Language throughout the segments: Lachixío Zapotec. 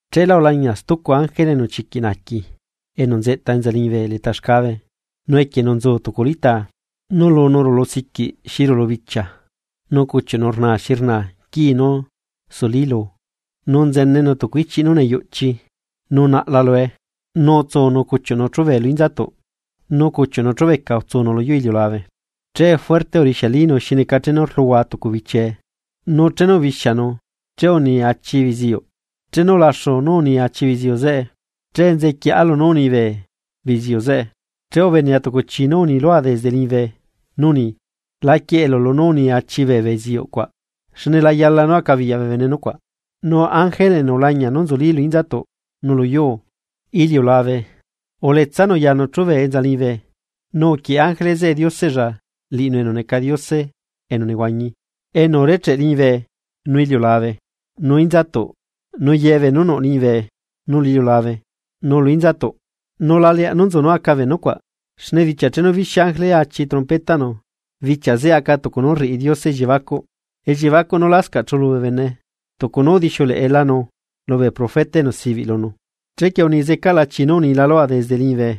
Chela ulañia stucu ángele enu chiquiꞌ naaqui, enu nzeꞌta enza liñibe leta xcabe nu equienu nzu tucu litaa. Nu lunu rulusiquiꞌ xi rulu bichia nu cuchiuꞌnu rnaa xi rnaa quii nú sulí luu, nu nzenenu tucu ichiꞌ nú neyuꞌchi nu naꞌla lue. Nu utsunu cuchiuꞌnu chube lu inzatuꞌ, nu cuchiuꞌnu chubeca utsunu lu yuu iliulabe. Che fuerte urixialinu xi neca chenu rluhua tucu bichiee nu chenu ubixianu che uni achi beziuꞌ. Chenu ulaxu nú uni achi beziuꞌ zeꞌe, che nzequieꞌa lunú uni bee beziuꞌ zeꞌe, che ubenea tucu chi nú uni lua desde liñibe, nú uni: ―La quieꞌelu lunú uni achi bee beziuꞌ cuaꞌ, xne la yala nú acabiyaꞌ bee bene nucuaꞌ. Nu ángele enu ulañia nú nzulí lu inzatuꞌ nu luyuu iliulabe uletsanu yanu chube enza liñibe, nu uquieꞌe ángele zeꞌe Dioseꞌlla liꞌinu enu neca Diose enu nehuañi, enu urecheꞌ liñibe, nu iliulabe, nu inzatuꞌ nu ye beenú nuꞌ liñibe nu lu iliulabe nu lu inzatuꞌ: ―Nu la leaꞌ nú nzu nú aca bee nucuaꞌ. Xne bichia chenu bixia ángele achi trompetaꞌnu, bichia zeꞌe aca tucu nú rriꞌi Diose elliebacuꞌ, elliebacuꞌ nú lascaꞌ chulu bee bene tucu nu udixiuleꞌelanu lubee profeta enu sibiꞌ lunu. Chequie uni zecaꞌla chi nú unila lua desde liñibe,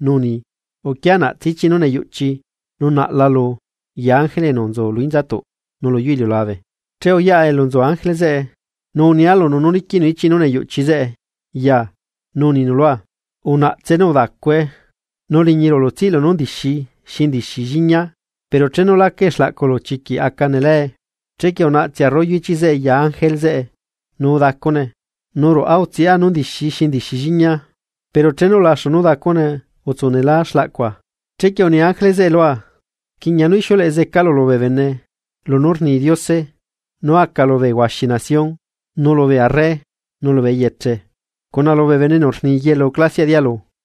nu uni: ―Uquia naꞌtse ichiꞌ nú neyuꞌchi nu naꞌla lu ya ángele enu nzu lu inzatuꞌ nu luyu iliulabe. Che uyaꞌa elu nzu ángele zeꞌe, nu unia lunu nú liquiꞌnu ichiꞌ nú neyuꞌchi zeꞌe ya nu uninu lua: ―Unaꞌtse nu udacue. Nu liñi ruꞌulu tsiꞌlu nú ndixi xi ndixi lliñia, pero chenu lacae xlaꞌculu chiquiꞌ aca nelae. Chequie unaꞌtsea rollo ichiꞌ zeꞌe ya ángele zeꞌe, nu udacune. Nu ruꞌa utsiꞌa nú ndixi xi ndixi lliñia, pero chenu ulaxu nú udacune utsu nelá xlaꞌcua. Chequie uni ángele zeꞌe lua rquiꞌña nú ixiuleꞌe zecalu lubee bene lunú rni Diose nú aca lu huaxi bee nación, nu lubee arre nu lubee eyeche, cuna lubee bene enu rni yelu clasiaꞌ dialu.